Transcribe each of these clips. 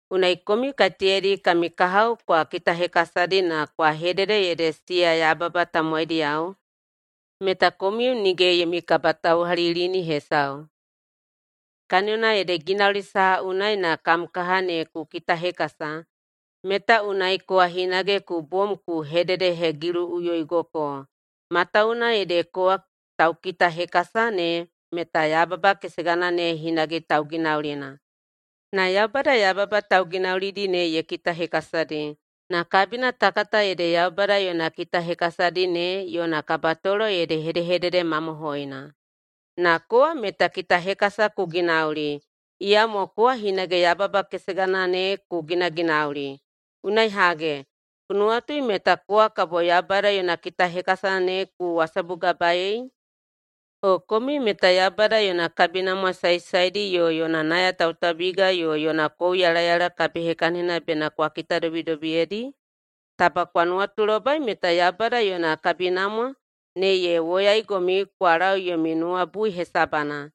Unai komiu kaiteyadi kami kahao kwa kitahekasadi na kwa hedede ede siya yababa tamowaidiyao meta komiu nige yomi kabatauhalilini hesau. Kaniyona ede ginauli saha unai na kam kaha ne ku kitahekasa meta unai kowa hinage ku bom ku hededehegiluꞌuyoigoko, matawuwuna ede kowa taukitahekasa ne meta yababa kesegana ne hinage tauginaulina. Na Yaubada yababa tauginaulidi ne ye kitahekasadi, na kabina ta kata ede Yaubada yona kitahekasadi ne yona kabatolo ede hedehedede mamohoina. Na kowa meta kitahekasa ku ginauli, iyamo kowa hinage yababa kesegana ne ku ginaginauli. Unai hage, ku nuwatui meta kowa kabo Yaubada yona kitahekasa ne ku wasabugabaei? O komiu meta Yaubada yona kabinamwa saesaedi yo yona nayatautaubiga yo yona kouyalayala kabihekahinina bena kwa kitadobidobiyedi? Taba kwa nuwatulobai meta Yaubada yona kabinamwa ne ye woyaigomiu kwa lau yomi nuwabui hesabana!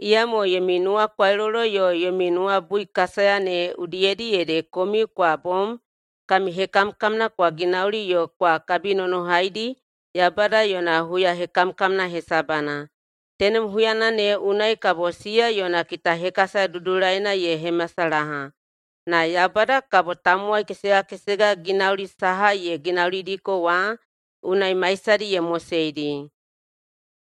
Iyamo yomi nuwakwailolo yo yomi nuwabuikasaya ne udiyedi ede komiu kwa bom kami hekamkamna kwa ginaulidi yo kwa kabinonohaidi Yaubada yona huyahekamkamna hesabana. Tenem huyana ne unai kabo iya yona kitahekasa dudulaina ye hemasalaha. Na Yaubada “kabo tamowai kesega kesega ginauli saha ye ginaulidiko wa unai maisadi ye moseidi.”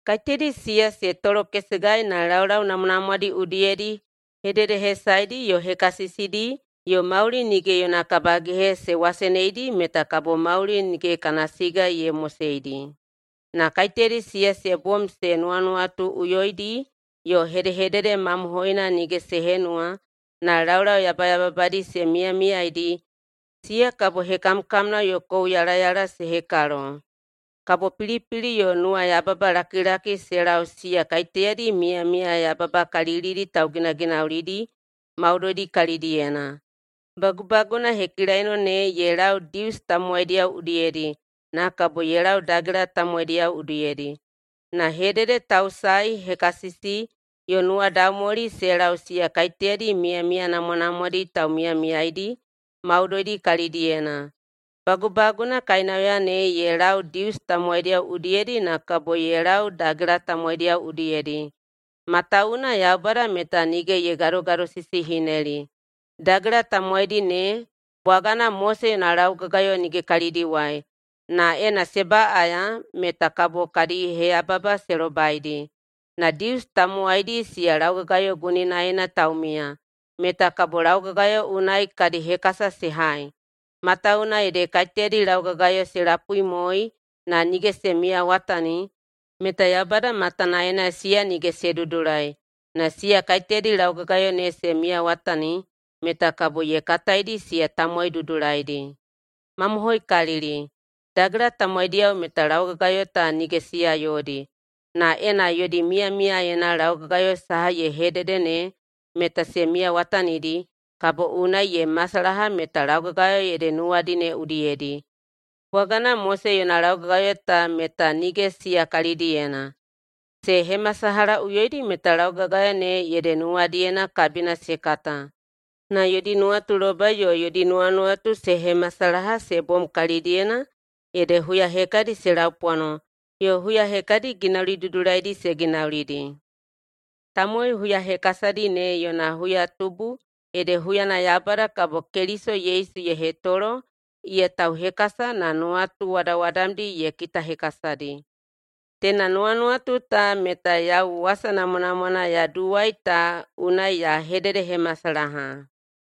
Kaiteyadi siya se tolokesegai na laulau namwanamwadi udiyedi hededehesaedi yo hekasisidi yo mauli nige yona kabagehe se waseneidi meta kabo mauli nige kana siga ye moseidi. Na kaiteyadi siya se bom se nuwanuwatuꞌuyoidi yo hedehedede mamohoina nige se henuwa na laulau yabayababadi se miyamiyaeidi, siya kabo hekamkamna yo kouyalayala se hekalo. Kabo pilipili yo nuwayababalakilaki se lau siya kaiteyadi miyamiya yababakalilidi tauginaginaulidi maudoidi kalidiyena. Bagubaguna hekilaino ne ye lau Dius tamowaidiyao udiyedi na kabo ye lau dagela tamowaidiyao udiyedi. Na hededetausae, hekasisi, yo nuwadaumwali se lau siya kaiteyadi miyamiya namwanamwadi taumiyamiyaeidi maudoidi kalidiyena. Bagubaguna kainauya ne ye lau Dius tamowaidiyao udiyedi na kabo ye lau dagela tamowaidiyao udiyedi. Matawuwuna Yaubada meta nige ye gadogadosisihineli. [Dagela tamowaidi ne,] bwagana Mose yona laugagayo nige kalidiwai, na ena se baꞌaya meta kabo kadi heyababa se lobaidi. Na [Dius tamowaidi], siya laugagayo guninaena taumiya, meta kabo laugagayo unai kadi hekasa se hai. Matawuwuna ede kaiteyadi laugagayo se lapuimoei [na nige se miyawatani], meta Yaubada matanaena siya nige se dudulai. Na siya kaiteyadi laugagayo ne se miyawatani meta kabo ye kataidi siya tamowai dudulaidi. Mamohoikalili, dagela tamowaidiyao meta laugagayo ta nige siya yodi. Na ena yodi miyamiyaena laugagayo saha ye hedede ne meta se miyawatanidi, kabo unai ye masalaha meta laugagayo ede nuwadi ne udiyedi, bwagana Mose yona laugagayo ta meta nige siya kalidiyena. Se hemasalahaꞌuyoidi meta laugagayo ne ede nuwadiyena kabina se kata, na yodi nuwatulobai yo yodi nuwanuwatu se hemasalaha se bom kalidiyena ede huya hekadi se laupwano yo huya hekadi ginauli dudulaidi se ginaulidi. Tamowai huyahekasadi ne yona huyatubu ede huyana Yaubada kabo Keliso Yesu ye hetolo iya tauhekasa na nuwatu wadawadamdi ye kitahekasadi. Teina nuwanuwatu ta meta yau wasa namwanamwana ya duwai ta unai ya hededehemasalaha.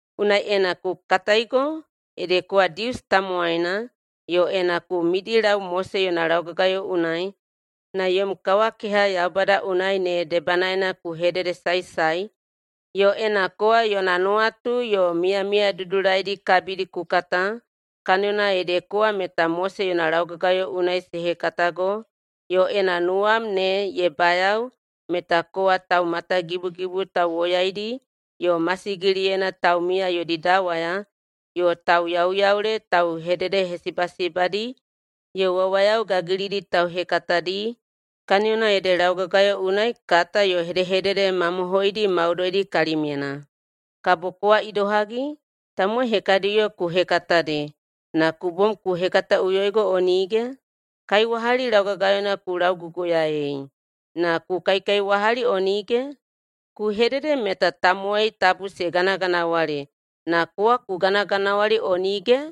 Unai ena ku kataigo ede kowa Dius tamowaina yo ena ku midilau Mose yona laugagayo unai na yom kawakeha Yaubada unai ne debanaena ku hededesaesae, yo ena kowa yona nuwatu yo miyamiya dudulaidi kabidi ku kata, kaniyona ede kowa meta Mose yona laugagayo unai se hekatago, yo ena nuwam ne ye bayao meta kowa taumatagibugibu tauwoyaidi yo masigiliyena taumiya yodi dawaya yo tauyauyaule tauhededehesibasibadi yo wawayao gagilidi tauhekatadi, kaniyona ede laugagayo unai kata yo hedehedede mamohoidi maudoidi kalimyena. Kabo kowa idohagi? Tamowai hekadiyo ku hekatadi, na ku bom ku hekataꞌuyoigo o nige? Kaiwahali laugagayona ku lauguguyaei, na ku kaikaiwahali o nige? Ku hedede meta tamowai tabu se ganaganawali, na kowa ku ganaganawali o nige?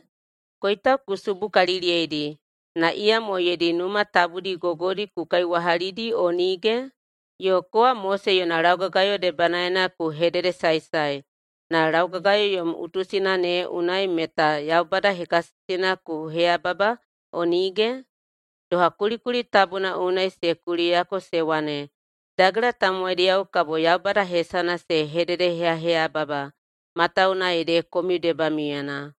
Koitau ku subukaliliyeidi, na iyamo yodi numa tabudi gogodi ku kaiwahalidi o nige? Yo kowa Mose yona laugagayo debanaena ku hededesaesae, na laugagayo yom utusina ne unai meta Yaubada hekasisina ku heyababa o nige? Doha kulikuli tabuna unai se kuliyako se wane, “Dagela tamowaidiyao kabo Yaubada hesana se hededeheyaheyababa matawuwuna ede komiu debamiuyena.”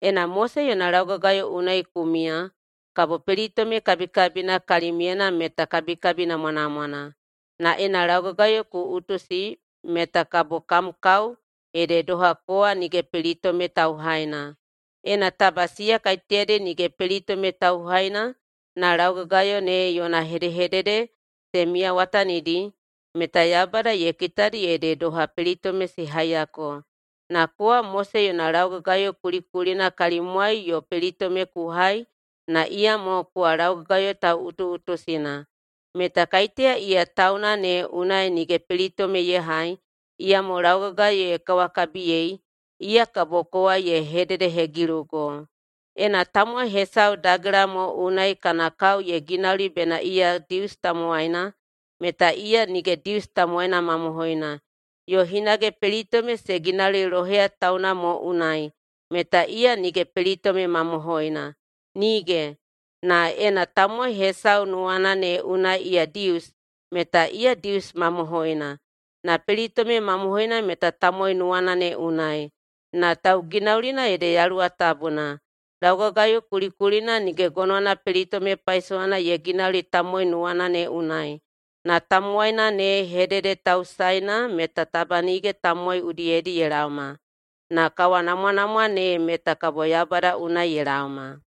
Ena Mose yona laugagayo unai ku miya, kabo pelitome kabikabina kalimyena meta kabikabi namwanamwana. Na ena laugagayo ku utusi meta kabo kam kao ede doha kowa nige pelitome tauhaina. Ena taba siya kaiteyadi nige pelitome tauhaina na laugagayo ne yona hedehedede se miyawatanidi, meta Yaubada ye kitadi ede doha pelitome se haiyako. Na kowa Mose yona laugagayo kulikulina kalimwai yo pelitome ku hai na iyamo kowa laugagayo tauꞌutuꞌutusina, meta kaiteya iya tauna ne unai nige pelitome ye hai, iyamo laugagayo ye kawakabiyei, iya kabo kowa ye hededehegilugo. Ena tamowai hesau dagela mo unai kana kao ye ginauli bena iya Dius tamowaina, meta iya nige Dius tamowaina mamohoina, yo hinage pelitome se ginauli loheya tauna mo unai meta iya nige pelitome mamohoina. Nige! Na ena tamowai hesau nuwana ne unai iya Dius, meta iya Dius mamohoina. Na pelitome mamohoina meta tamowai nuwana ne unai, na tauginaulina ede Yaluwa Tabuna. Laugagayo kulikulina nige gonowana pelitome paisowana ye ginauli tamowai nuwana ne unai. Na tamowaina ne hededetausaeina meta taba nige tamowai udiyedi ye laoma, na kawanamwanamwa ne meta kabo Yaubada unai ye laoma.